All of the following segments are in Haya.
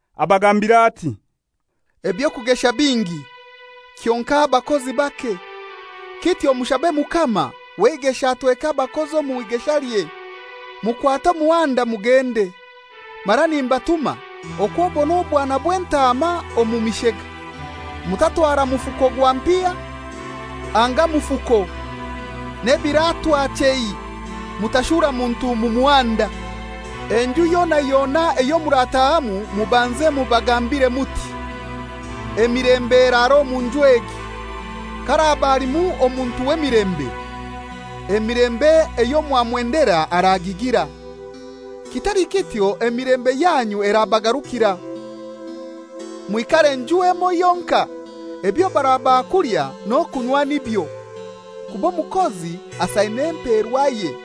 Abagambira ati, «Eby'okugesha bingi, kyonkai abakozi bake. Kityo mushabe mukama w'eigesha atweke abakozi omu igeshalye. Mukwate omuhanda mugende, mara nimbatuma okw'obona obwana bw'entaama omu mishega. Mutatwara mufuko gwa mpiha, anga mufuko, n'ebiratwa chei. Mutashura muntu mu muhanda. Enju yona yona eyo muratahamu mubanze mubagambire muti, ‹Emilembe eraare omu nju egi!› Ka haraka alimu omuntu w'emilembe, emilembe eyo mwamwendera aragigira. Kitali kityo emilembe yanyu erabagarukira. Mwikare nju emoi yonkai, ebyo barabaha kulya n'okunywa nibyo, kuba omukozi asaine emperwaye;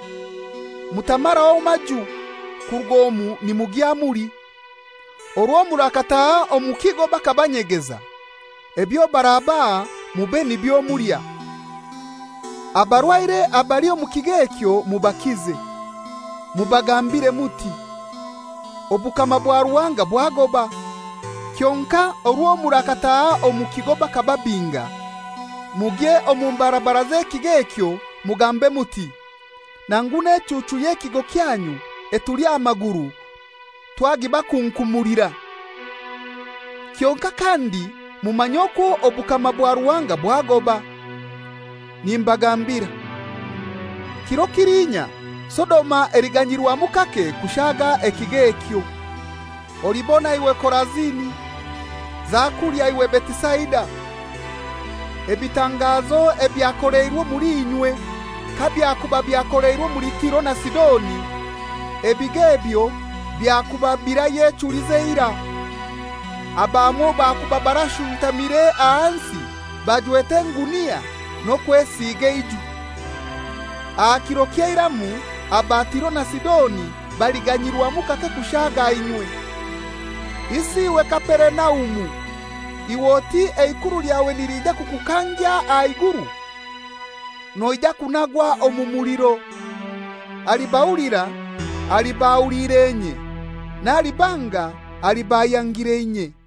mutamaraho maju, kuruga omu nimugya muli. Orwo murakataha omu kigo bakabanyegeza, ebyo barabaha mube nibyo mulya. Abarwaire abali omu kigo ekyo mubakize, mubagambire muti, ‹Obukama bwa Ruhanga bwagoba.› Kyonkai orwo murakataha omu kigo bakababinga, mugye omu mbarabara z'ekigo ekyo mugambe muti, ‹Nangu n'echuuchu y'ekigo kyanyu etuli aha maguru twagibakunkumulira; kyonkai kandi mumanye okwo obukama bwa Ruhanga bwagoba.› Nimbagambira: Kiro kiliinya Sodoma eliganyirwamu kake kushaaga ekigo ekyo. «Olibona iwe Korazini! Zakulya iwe Betisaida! Ebitangazo ebyakoleirwe omuli inywe kabyakuba byakoleirwe omuli Tiro na Sidoni, ebigo ebyo byakuba birayechulize eirai; abamwo bakuba barashuntamire ahansi barajwete engunia n'okwesiga eijwi. Aha kiro ky'eiramu aba Tiro na Sidoni baliganyirwamu kake kushaaga inywe. Isi iwe Kaperinaumu, iwe oti eikuru lyawe niliija kukukangya aha iguru? Noija kunagwa omu muliro! Alibahulira aliba ahuliire inye, n'alibanga aliba ayangire inye.»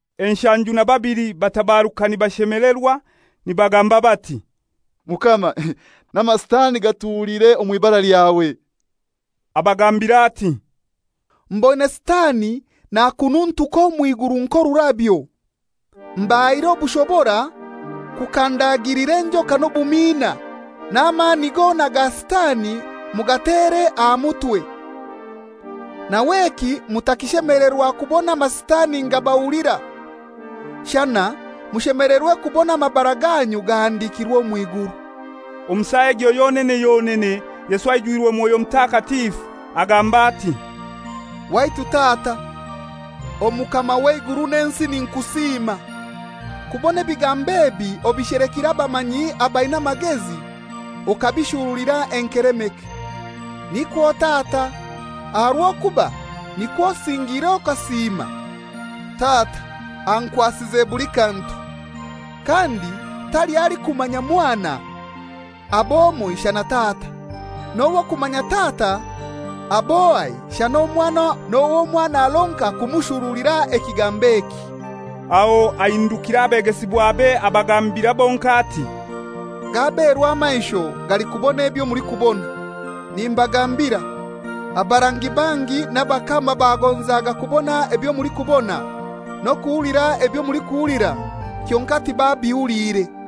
Enshanju na babili batabaruka nibashemelerwa, nibagamba bati, «Mukama, n'amasitani gatuhuliire omw'ibara lyawe!» Abagambira ati, «Mboine Sitani nakununtuka omw'iguru nk'orurabyo. Mbahaire obushobora kukandagilira enjoka n'obumiina, n'amani gona ga Sitani mugatere aha mutwe. Nawe eki mutakishemelerwa kubona amasitani nigabahulira; shana mushemelerwe kubona amabara ganyu gahandikirwe omw'iguru.» Omu saa egyo yonene yonene Yesu aijwire Mwoyo Mutakatifu, agamba ati, «Waitu Tata, Omukama w'eiguru n'ensi ninkusiima, kubona ebigambo ebi obishelekire abamanyi abaina amagezi okabishurulira enkelemeke. Nikwo Tata, aha rw'okuba nikwo osingire okasiima. Tata ankwasize buli kantu. Kandi taliho alikumanya Mwana ab'ohai, shana Tata. N'ow'okumanya Tata ab'ohai shana Omwana n'owo Mwana aronka kumushurulira ekigambo eki.» Aho ahindukira abegesibwabe abagambira bonkai ati, «Gaberwa amaisho galikubona ebyo mulikubona! Nimbagambira, abarangi bangi n'abakama bagonzaga kubona ebyo mulikubona, n'okuhulira ebyo mulikuhulira, kyonkai tibabihuliire.»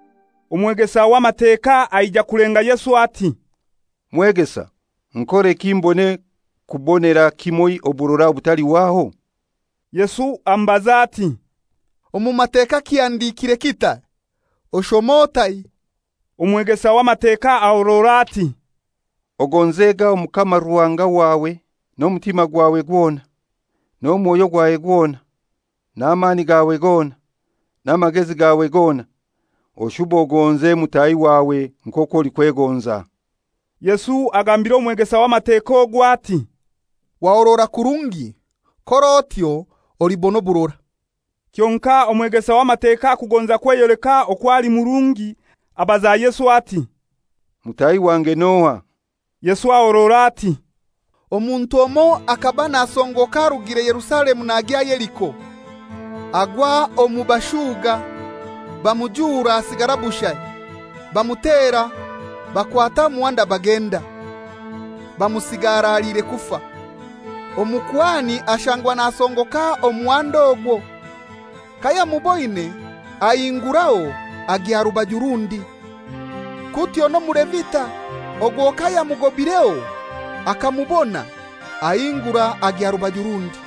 Omwegesa w'Amateka aija kulenga Yesu ati, «Mwegesa, nkoreki mbone kubonera kimoi oburora obutalihwaho?» Yesu amubaza ati, «Omu Mateka kihandikire kitai? Oshoma otai?» Omwegesa w'Amateka ahorora ati, «Ogonzega Omukama Ruhanga wawe n'omutima gwawe gwona, n'omwoyo gwawe gwona, n'amani gawe gona, n'amagezi gawe gona; oshube ogonze mutahi wawe nk'okwo olikwegonza.» Yesu agambira omwegesa w'Amateka ogwo ati, «Wahorora kurungi; kor'otyo olibona oburora.» Kyonkai omwegesa w'Amateka kugonza kweyoleka okwo ali murungi, abaza Yesu ati, «Mutahi wange n'ohai?» Yesu ahorora ati, «Omuntu omoi akaba nasongoka arugire Yerusalemu nagya Yeriko, agwa omu bashuga, bamujura asigara bushai, bamutera, bakwata omuhanda bagenda, bamusiga araliire kufa. Omukuhani ashangwa nasongoka muhanda ogwo. Kayamuboine ahinguraho agya rubaju rundi. Kutyo n'Omulevita, ogwo kayamugobireho akamubona, ahingura agya rubaju rundi.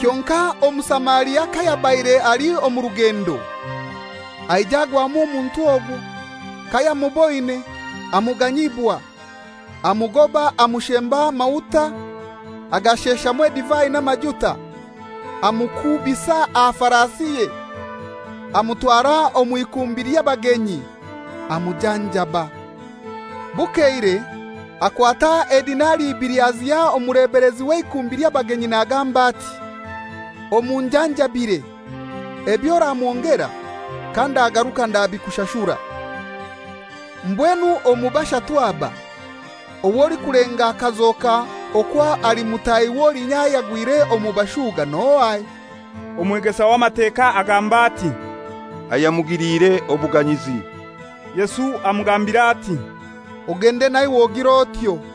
Kyonkai Omusamaria kayabaire ali omu rugendo, aija agwamu omuntu ogwo. Kayamuboine, amuganyibwa. Amugoba amushemba amahuta, agasheshamu edivai n'amajuta, amukuubisa aha farasiye, amutwara omw'ikumbi ly'abagenyi, amujanjaba. Bukeire akwata edinari ibili aziha omulebelezi w'eikumbi ly'abagenyi nagamba ati, ‹Omunjanjabire. Eby'oramwongera kandagaruka ndabikushashura.› Mbwenu omu bashatu aba, ow'olikulenga akazoka okwo ali mutahi w'olinya ayagwire omu bashuga n'ohai?» Omwegesa w'Amateka agamba ati, «Ayamugiliire obuganyizi.» Yesu amugambira ati, «Ogende naiwe ogir'otyo.»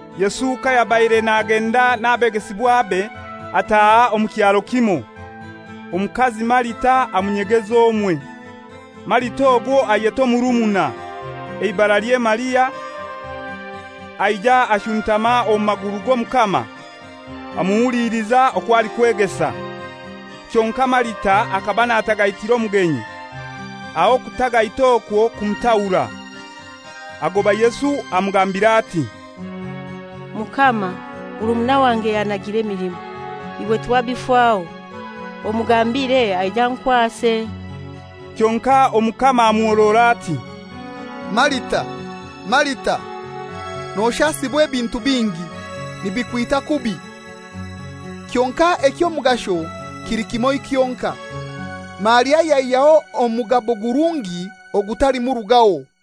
Yesu kayabaire nagenda n'abegesibwabe, ataaha omu kyaro kimoi. Omukazi Marita amunyegeza omwe. Marita ogwo ayeta omurumuna, eibaralye Maria, aija ashuntama omu maguru g'Omukama, amuhuliliza okwo alikwegesa. Kyonkai Marita akaba natagaitira omugenyi; aho okutagaita okwo kumutahura. Agoba Yesu amugambira ati, «Mukama, murumuna wange yannagira emilimo, iwe tiwabifaho? Omugambire aije ankwase.» Kyonkai Omukama amuhorora ati, «Marita, Marita, noshasibwa ebintu bingi, nibikwita kubi. Kyonkai eky'omugasho kili kimoi kyonkai. Maria yaihyaho omugabo gurungi ogutalimurugaho.»